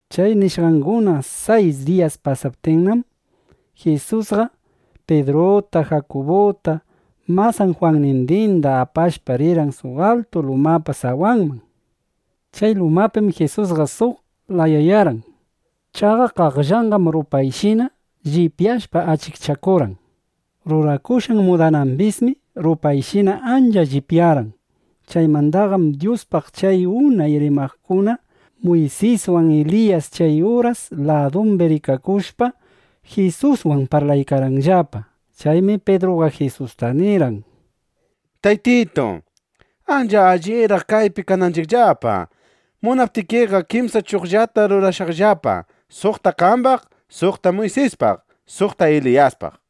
Chay nishqanguna sayis diyas pasaptinnam, Jisusqa Pidruta, Jakubuta, masan Jwannindinda apashpa, rirqan suq altu lumapa sawanman. Chay lumapim Jisusqa suq layayarqan. Chaqa qaqllanqam rupayshina llipyashpa, achikchakurqan. Rurakushqan mudanambismi rupayshina ancha llipyarqan. Chaymandaqam Dyuspaq chay unay rimaqkuna Muysiswan Eliyas chay uras ladumbi rikakushpa, Jisuswan parlaykarqanllapa. Chaymi Pidruqa Jisusta nirqan: —Taytitu, ancha alliraq kaypi kananchiqllapa. Munaptikiqa, kimsa chuqllata rurashaqllapa, suqta qambaq, suqta Muysispaq, suqta Eliyaspaq, nishpa.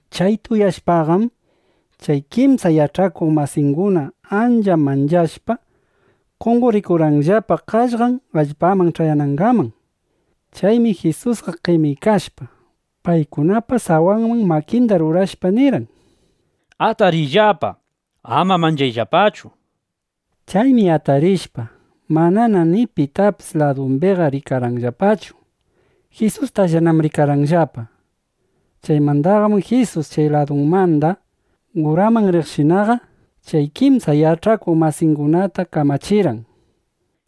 Chayta uyashpaqam, chay kimsa yach'akuq masiykunaqa ancha manchashpa, qonqorikurqanllapa qaqllanllapa allpaman ch'ayanangaman. Chaymi Jisusqa qemikashpa, paykunapa sawanman makinda rurashpa, nirqan: —Atariyllapa. Ama manchayllapachu, nishpa. Chaymi atarishpaqa, manana ni pitapis ladumbiqa rikarqanllapachu. Jisustallanam rikarqanllapaqa. Chaymandaqam Jisus chay lumamanda uraman riqshinaqa, chay kimsa yach'akuq masiykunata kamachirqan: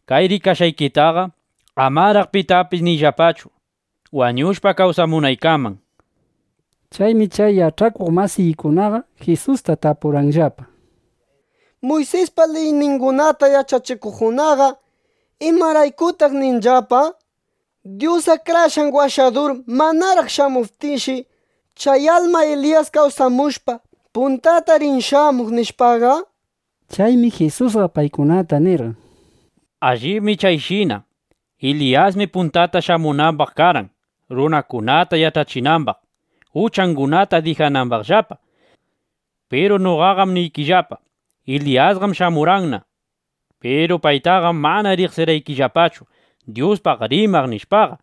—Kay rikashqaykitaqa amaraq pitapis niyllapachu, wañushpa kawsamunaykaman, nishpa. Chaymi chay yach'akuq masiykunaqa Jisusta tapurqanllapa: —Muysispa liyningunata yach'achikuqkunaqa ¿imaraykutaq ninllapa: “Dyus Akrashqan Washadur manaraq shamuptinshi, chay alma Eliyas kawsamushpa, puntata rin shamuq”, nishpaqa? Chaymi Jisusqa paykunata nirqan: —Allibmi chayshina. Eliyasmi puntata shamunambaq karqan, runakunata yach'achinambaq, uchangunata dijanambaqllapa. Piru noqaqam niykillapa, Eliyasqam shamurqanna. Piru paytaqam mana riqsirqanllapachu, Dyuspaq rimaq, nishpaqa.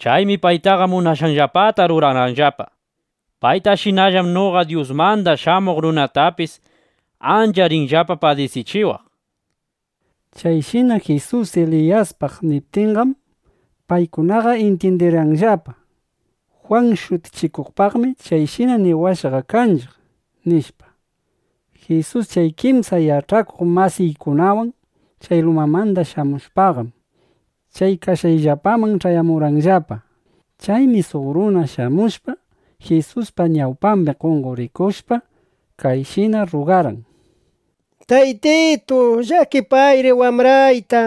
Chaymi paytaqa munashqanllapata rurarqanllapa. Paytashinallam noqa Dyusmanda Shamuq Runatapis ancha rinllapa padisichiwaq, nishpa. Chayshina Jisus Eliyaspaq niptinqam, paykunaqa intyindirqanllapa: Jwan Shutichikuqpaqmi chayshina niwashqaqa kanchiq, nishpa. Jisus chay kimsa yach'akuq masiykunawan chay lumamanda shamushpaqam, chay kashqayllapaman ch'ayamurqanllapa. Chaymi suq runa shamushpa, Jisuspa ñawpambi qonqorikushpa, kayshina rrugarqan: —Taytitu, llakipayri wambrayta.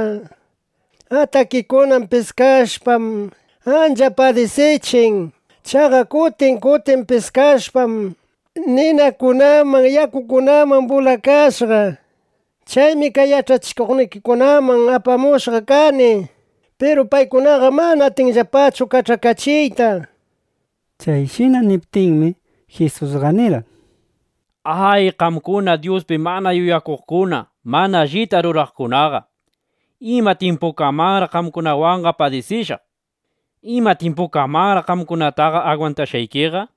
Atakikuna piskashpam, ancha padisichin. Chaqa kutin kutin piskashpam, ninakunaman yakukunaman bulashqa. Chaymi kay yach'akuqnikikunaman apamushqa kani. Piru paykunaqam mana atishqallapachu kach'akachiyta, nishpa. Chayshina niptinmi, Jisusqa nirqan: —¡A, qamkuna Dyuspi mana yuyakuqkuna, mana allita ruraqkunaqa! ¿Ima tyimpukamanraq qamkunawanqa padisishaq? ¿Ima tyimpukamanraq qamkunataqa agwantashqaykiqa?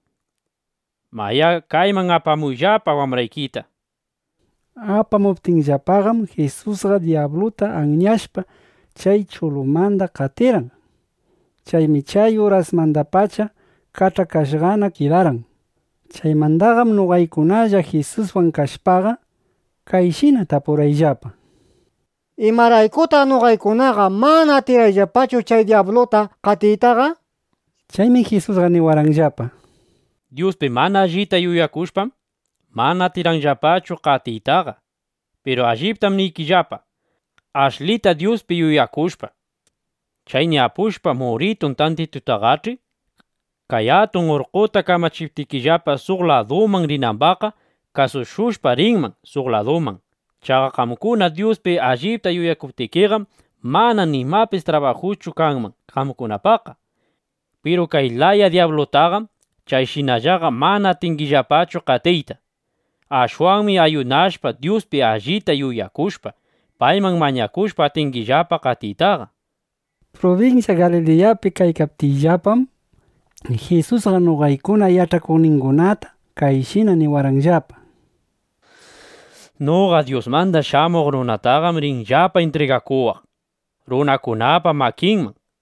Mayá, kayman apamuyllapa wambraykita, nishpa. Apamuptinllapaqam, Jisusqa dyabluta anyashpa, chay chulumanda qatirqan. Chaymi chay urasmandapacha kach'akashqana kidarqan. Chaymandaqam noqaykunalla Jisuswan kashpaqa, kayshina tapurqayllapa: —¿Imaraykutaq noqaykunaqa mana atirqayllapachu chay dyabluta qatiytaqa? nishpa. Chaymi Jisusqa niwarqanllapa: —Dyuspi mana allita yuyakushpam, mana atirqaykillapachu qatiytaqa. Piru alliptam niykillapa, ashlita Dyuspi yuyakushpa, chay ñapushpa muritun tantitutaqach'i, kay atun urqqota kamachiptikillapa suq laduman rinambaqqa, kasushushpa rinman suq laduman. Chaqa qamkuna Dyuspi allipta yuyakuptikiqam, mana nimapis trabajuschu kanman qamkunapaqqa. ˻ Piru kay laya dyablutaqam chayshinallaqa mana atingillapachu qatiyta. Ashwanmi ayunashpa, Dyuspi allita yuyakushpa, payman mañakushpa atingillapa qatiytaqa, nishpa.˼ Prubinsya Galiliyapi kaykaptiyllapam, Jisusqa noqaykuna yach'akuqningunata kayshina niriwarqanllapa: —Noqa Dyusmanda Shamuq Runataqam rinllapa intrigakuwaq runakunapa makinman.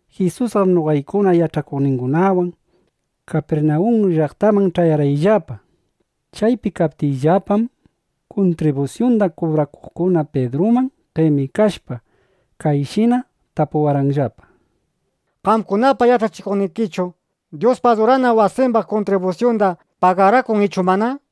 Jisusqam noqaykuna yach'akuqningunawan Kapirnawun llaqtaman ch'ayarqayllapa. Chaypi kaptiyllapam, kuntribusyunda kubrakuqkuna Pidruman qemikashpa, kayshina tapurqanllapa: —¿Qamkunapa yach'achikuqnikichu Dyuspa adurana wasimbaq kuntribusyunda pagarakun ichu mana? nishpa.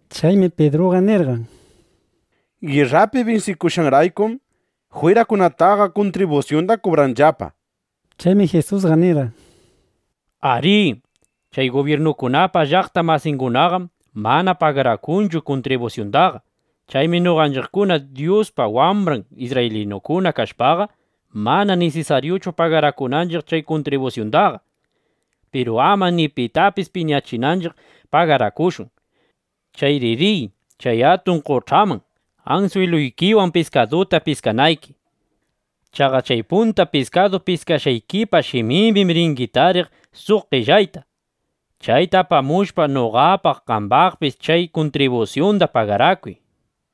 Chaymi Pidruqa nirqan: —(Girrapi binsishqanraykum), jwirakunataqa kuntribusyunda kubranllapa, nishpa. Chaymi Jisusqa nirqan: —Arí. Chay gubyirnukunapa llaqta masingunaqam mana pagarakunchu kuntribusyundaqa. (Chaymi noqanchiqkuna Dyuspa wambran isrraylinukuna kashpaqa, mana nisisaryuchu pagarakunanchiq chay kuntribusyundaqa.) Piru ama ni pitapis piñachinanchiq pagarakushun. Chayri riy chay atun qoch'aman, answiluykiwan piskaduta piskanayki. Chaqa chay punta piskadu piskashqaykipa shimimbim ringi tariq suq qellayta. Chayta apamushpa, noqapaq qambaqpis chay kuntribusyunda pagarakuy, nishpa.